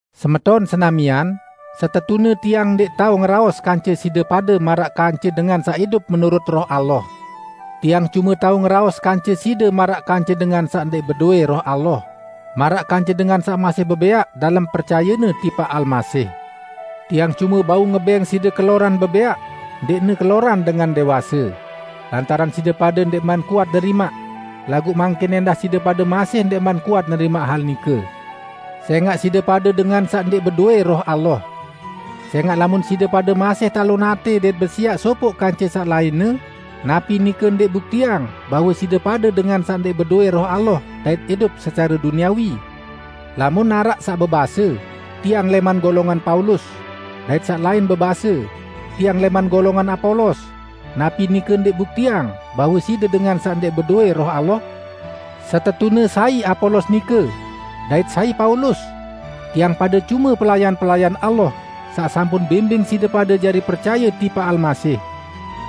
Semeton senamian, setetune tiang ndẽq tao ngeraos kance side pade maraq kance dengan saq idup menurut Roh Allah. Tiang cume tao ngeraos kance side maraq kance dengan saq ndẽq bedowẽ Roh Allah; maraq kance dengan saq masih bebẽaq dalem percayenne tipaq Almasih. Tiang cume bau ngebẽng side keloran bebẽaq, ndẽqne keloran dengan dẽwase; lantaran side pade ndẽqman kuat nerimaq. Laguq mangkin ẽndah side pade masih ndẽqman kuat nerimaq hal nike, sẽngaq side pade dengan saq ndẽq bedowẽ Roh Allah. Sẽngaq lamun side pade masih talon atẽ dait besiaq sopoq kance saq lainne, napi nike ndẽq buktiang bahwe side pade dengan saq ndẽq bedowẽ Roh Allah dait idup secare duniawi? Lamun araq saq bebase, "Tiang lẽman golongan Paulus", dait saq lain bebase, "Tiang lẽman golongan Apolos", napi nike ndẽq buktiang bahwe side dengan saq ndẽq bedowẽ Roh Allah? Setetune sai Apolos nike? Dait sai Paulus? Tiang pade cume pelayan-pelayan Allah, saq sampun bimbing side pade jari percaye tipaq Almasih.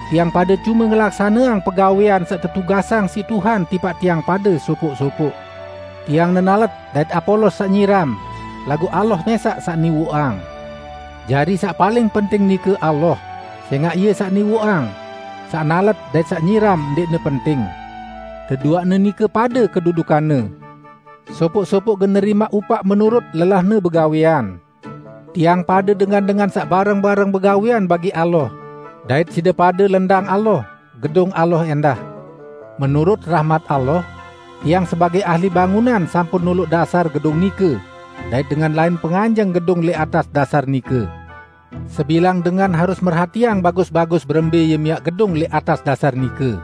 Tiang pade cume ngelaksaneang pegawẽan saq tetugasang siq Tuhan tipaq tiang pade sopoq-sopoq. Tiang nenalet dait Apolos saq nyiram, laguq Allah mẽsaq saq niwoqang. Jari saq paling penting nike Allah, sẽngaq Ie saq niwoqang. Saq nalet dait saq nyiram ndẽqne penting; deduaqne nike pade kedudukanne. Sopoq-sopoq gen nerimaq upaq menurut lelahne begawẽan. Tiang pade dengan-dengan saq bareng-bareng begawẽan bagi Allah; dait side pade, lendang Allah, gedung Allah ẽndah. Menurut rahmat Allah, tiang sebagẽ ahli bangunan sampun noloq dasar gedung nike, dait dengan lain penganjeng gedung lẽq atas dasar nike. Sebilang dengan harus merhatiang bagus-bagus berembẽ ie miaq gedung lẽq atas dasar nike.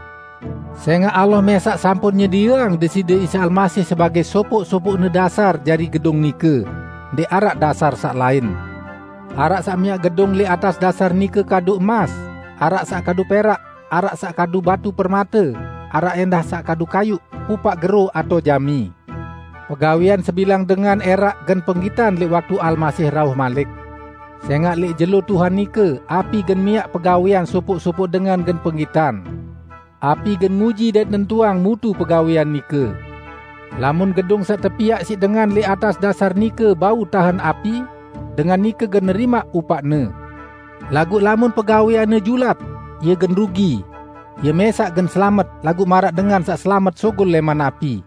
Sẽngaq Allah mẽsaq sampun nyedieang Deside Isa Almasih sebagẽ sopoq-sopoqne dasar jari gedung nike; ndẽq araq dasar saq lain. Araq saq miaq gedung lẽq atas dasar nike kadu emas, araq saq kadu perak, araq saq kadu batu permate, araq ẽndah saq kadu kayuq, pupaq gero atao jami. Pegawẽan sebilang dengan ẽraq gen penggitan lẽq waktu Almasih rauh malik. Sẽngaq lẽq jelo Tuhan nike api gen miaq pegawẽan sopoq-sopoq dengan gen penggitan. Api gen nguji dait nentuang mutu pegawẽan nike. Lamun gedung saq tepiaq siq dengan lẽq atas dasar nike bau tahen api, dengan nike gen nerimaq upaqne. Laguq lamun pegawẽanne julat, ie gen rugi; ie mẽsaq gen selamet, laguq maraq dengan saq selamet sugul lẽman api.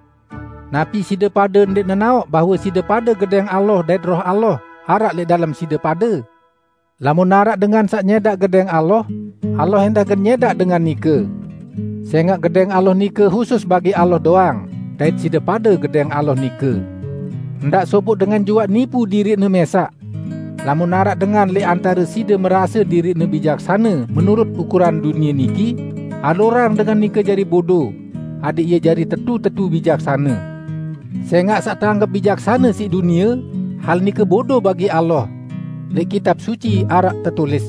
Napi side pade ndẽq nenaoq bahwe side pade gedẽng Allah dait Roh Allah araq lẽq dalem side pade? Lamun araq dengan saq nyẽdaq gedẽng Allah, Allah ẽndah gen nyẽdaq dengan nike. Sẽngaq Gedẽng Allah nike husus bagi Allah doang, dait side pade gedẽng Allah nike. Ndaq sopoq dengan juaq nipu diriqne mẽsaq. Lamun araq dengan lẽq antare side merase diriqne bijaksane menurut ukuran dunie niki, alurang dengan nike jari bodo, adẽq ie jari tetu-tetu bijaksane. Sẽngaq saq teanggep bijaksane siq dunie, hal nike bodo bagi Allah. Lẽq Kitab Suci araq tetulis,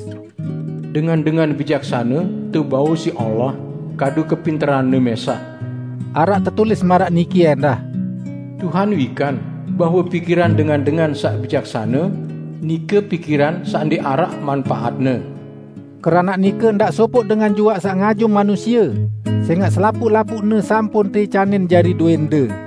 "Dengan-dengan bijaksane tebau siq Allah kadu kepinteranne mẽsaq." Araq tetulis maraq niki ẽndah, "Tuhan wikan bahwe pikiran dengan-dengan saq bijaksane, nike pikiran saq ndẽq araq manpaatne." Keranaq nike, ndaq sopoq dengan juaq saq ngajum manusie, sẽngaq selapuq-lapuqne sampun teicanin jari dowẽnde: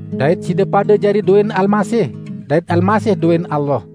Dait side pade jari dowẽn Almasih, dait Almasih dowẽn Allah.